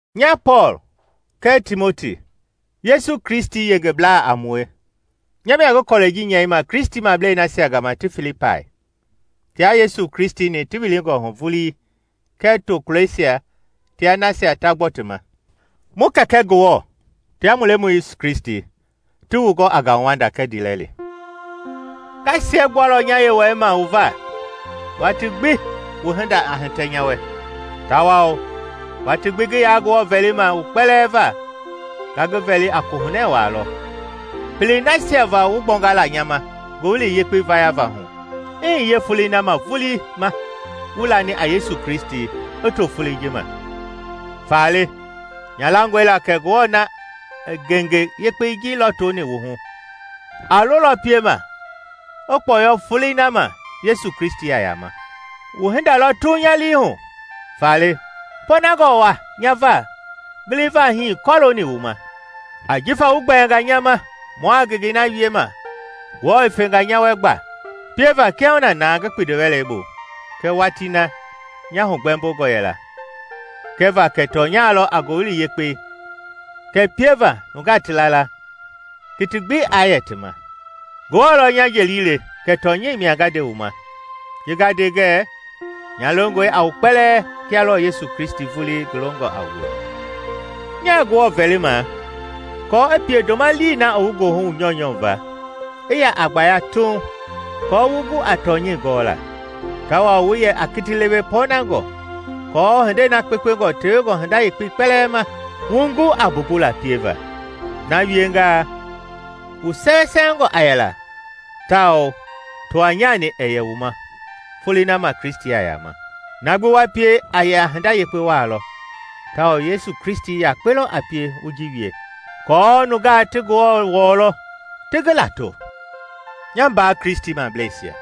Nya Pɔɔl, kɛɛ Timoti, Yesu Kristi yengeblaa a mue, nya mia ngi kɔlɛi ji nyɛima Kristimablei nasia gama ti Filipai, tia Yesu Kristi-ni ti wilingɔ hu vulii kɛɛ tokulɔisia tia nasia ta gbɔ ti ma. Mu Kɛkɛ Ngewɔ tia mu Lemɔi Yesu Kristi ti wu gɔ a ngauwanda kɛɛ ndiilɛli. Nga siɛgbualɔ nya Yewɔɛi ma wu va watii gbi wu hinda a hitɛ nya wɛ; tawao watii gbi ngi yaa Ngewɔ vɛlima wu kpɛlɛɛ va nga ngi vɛli a kohunɛ waa lɔ, pelei nasia va wu gbɔnga la nya ma Ngowili Yekpei vayava hu i hiye folei na vulii ma wu lani a Yesu Kristi i to folei ji ma. Faale nya langɔe la kɛ Ngewɔ na i ngenge yekpei ji lɔtoni wu hu, a lolɔ piema i kpɔyɔ Folei na ma Yesu Kristi a yama. Wu hinda lɔ Tuuŋ nya lii hu! Faale pɔɔnangɔ nya va giliva hii kɔlooni wu ma; ajifa wu gbɛɛnga nya ma mua ngengei na wiema Ngewɔ i fenga nya wɛ gba pieva kiahuna na ngi kpindiwɛlɛ bu kɛɛ watii na nya hugbɛmbongɔ yɛla kɛva kɛ tɔnya lɔ a Ngowili Yekpei kɛɛ pieva nungaa ti la la kiti gbi aa yɛ ti ma. Ngewɔ lɔ nya jeli le kɛ tɔnyɛi mia nga nde wu ma ji nga nde ngɛɛ nya longɔe a wu kpɛlɛɛ kia lɔɔ Yesu Kristi vulii ngi longɔ a wue. Nyaa Ngewɔ vɛlima aako i pie ndoma lii na i wu goohu wu nyɔunyɔ va i ya a gbaya Tuuŋ kɔɔ wu gu a tɔnyɛi gɔla, tawao wu yɛ a kiti lewe pɔɔnangɔ, aako hindei na kpekpengɔ tewengɔ hinda yekpei kpɛlɛɛ ma wu gu a mbumbula pieva. Na wiengaa wu sɛwɛsɛwɛngɔ a yɛla tawao tɔwanyani ɛɛ yɛ wu ma Folei na ma Kristi a yama. Na gbi wa pie a yɛ a hinda yekpe waa lɔ tawao Yesu Kristi yakpe lɔ a pie wu ji wie, aako nungaa ti Ngewɔ wɔlɔ, ti ngi lato. Nya mbaa Kristimableisia,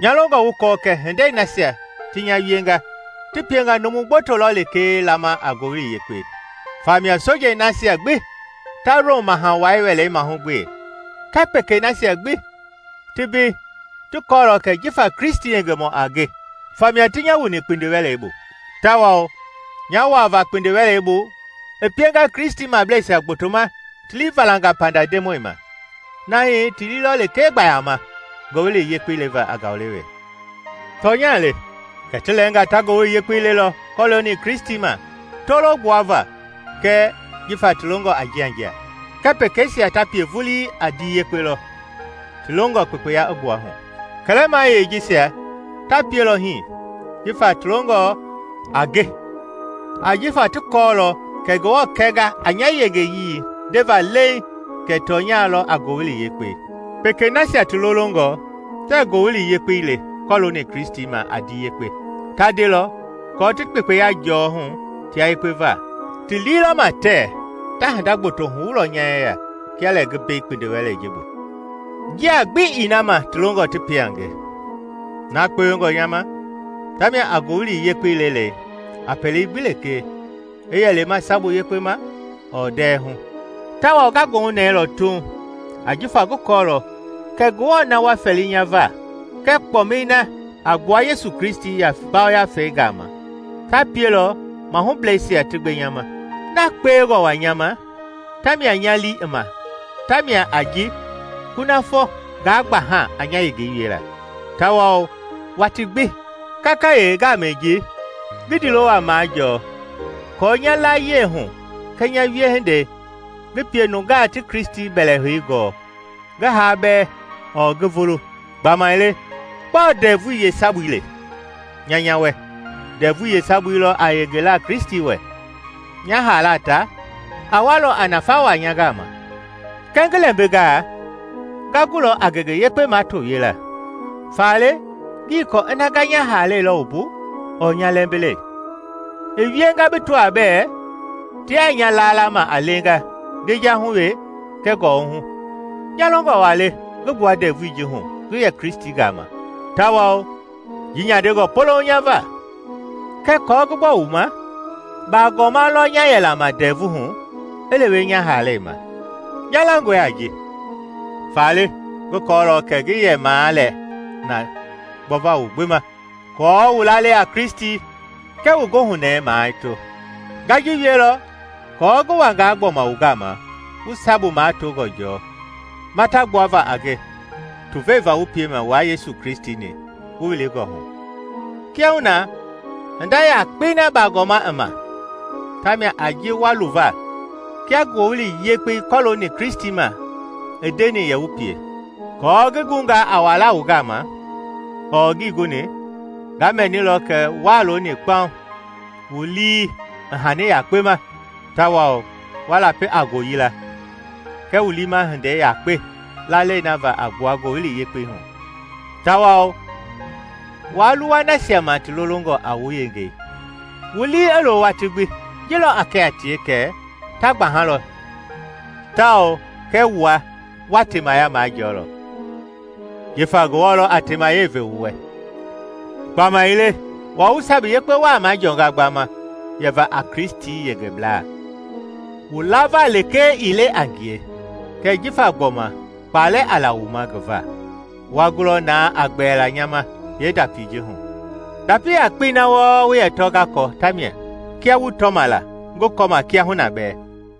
nya longɔ wu kɔɔ kɛ hindei nasia ti nya wienga ti pienga numu gboto lɔ lekee lama a Ngowili Yekpei. Famia sojei nasia gbi ta Rom Maha Wai wɛlei mahugbe kɛɛ pekei nasia gbi ti mbei ti kɔɔlɔ kɛ jifa Kristi yengemɔ a nge famia ti nya wuni kpindiwɛlei bu. Tawao nya wuava kpindiwɛlei bu i pienga Kristimableisia gbotoma ti lii valanga panda Ndemɔi ma na hii ti lii lɔ lekee gbaama Ngowili Yekpei leva a ngaulewe. Tɔnya le kɛ ti lɛɛnga ta Ngowili Yekpei lelɔ kɔlooni Kristi ma tolo gbuava kɛɛ jifa ti longɔ a njianjia, kɛɛ pekeisia ta pie vulii a ndii yekpe lɔ ti longɔ kpekpeya i gbua hu. Kɛlɛmayei jisia ta pielɔ hii jifa ti longɔ a nge ajifa ti kɔɔlɔ kɛ Ngewɔ kɛnga a nya yenge ndeva leiŋ kɛ tɔnya lɔ a Ngowili Yekpei. Pekei nasia ti lolongɔ tɛɛ Ngowili Yekpei le kɔlooni Kristi ma a ndii yekpe, ta ndelɔ aako ti kpekpeya jɔɔ hu tia yekpe va; ti lii lɔ ma tɛɛ ta hinda gboto huwulɔ nya yeya kia lɛ ngi mbei kpindiwɛlei ji bu. Njia gbi ii na ma ti longɔ ti pie a nge! Na kpewengɔ nya ma ta mia a Ngowili Yekpei lelei a pele gbi lekee, i yɛ lema sabu yekpe ma ɔɔ ndɛhu. Tawao nga goohunɛɛlɔ Tuuŋ, ajifa ngi kɔɔlɔ kɛ Ngewɔ na wa fɛli nya va kɛɛ kpɔmɛi na a gbua Yesu Kristi Yafei gama ta pielɔ mahubleisia ti gbe nya ma. Na kpewengɔ waa nya ma tawao nya lii i ma ta mia a ji kunafɔ ngaa gbaha a nya yengei wiela, tawao waati gbi, kakayee ngamɛi ji, ngi ndiilo waa majɔɔ aako nya layie hu kɛɛ nya wiehindei ngi pie nungaa ti Kristi mbɛlɛhei gɔɔ, ngi haa bɛɛ ɔɔ ngi vulu. Gbamaile gbɔɔ ndɛvui yeesabui le? Nya nya wɛ, ndɛvui yeesabui lɔ a yengela Kristi wɛ. Nya haala ta, a walɔ a nafa wa nya gama. Kɛɛ ngi lɛmbingaa nga gulɔ a ngenge yekpe mato wiela, faale ngii kɔɔ ina nga nya haalɛi lɔ wumbu ɔɔ nya lɛmbilɛi. I wienga bi tɔaa bɛ tia nya laalama a leenga ngejahu we kɛɛ kɔwɔhu. Nya longɔ waa le ngi gbua ndɛvui ji hu ngi yɛ Kristi gama, tawao ji nyandengɔ polouŋ nya va. Kɛɛ aako ngi gbɔ wu ma, baagɔma lɔ nya yɛla ma ndɛvu hu i lewe nya haalɛi ma. Nya langɔe a ji, faale ngi kɔɔlɔ kɛ ngi yɛmaa lɛ na gbɔva wu gbi ma, aako wu lalei a Kristi kɛɛ wu goohunɛɛ mato. Nga ji wielɔ kɔɔ ngi wangaa gbɔma wu gama wu sabu matongɔ jɔɔ mata gbuava a nge tuvei va wu piema wua Yesu Kristi-ni wu wilingɔ hu. Kiahuna hinda yakpei na baagɔma i ma tamia a ji wa luva kia Ngowili Yekpei kɔlooni Kristi ma i ndeni yɛ wu pie, kɔɔ ngi gungaa a wala wu gama ɔɔ ngii guni, nga mɛnilɔ kɛ wuaa looni kpaŋ, wu lii i hani yakpe ma tawao wa lapi a ngooyila kɛɛ wu liima hindei yakpe lalei na va a gbua Ngowili Yekpei hu, tawao waa luwa nasia ma ti lolongɔ a wu yengei. Wu lii i loo watii gbi; ji lɔ a kɛ a tie kɛ ta gbahalɔ tawao kɛ wua wa temaya majɔɔlɔ, jifa Ngewɔ lɔ a teemayɛi ve wu wɛ. Gbamaile wua wu sabu yekpe waa majɔɔnga gbama yɛva a Kristi yengeblaa, wu lava lekee ii le a ngie, kɛɛ jifa gbɔma kpaalɛ a la wu ma ngi va. Wa gulɔ na a gbɛɛla nya ma yeendapii ji hu. Ndapi yakpei na wu yɛ tɔ wɔɔ nga kɔ ta mia, kia wu tɔma la, ngi kɔma kiahuna bɛɛ.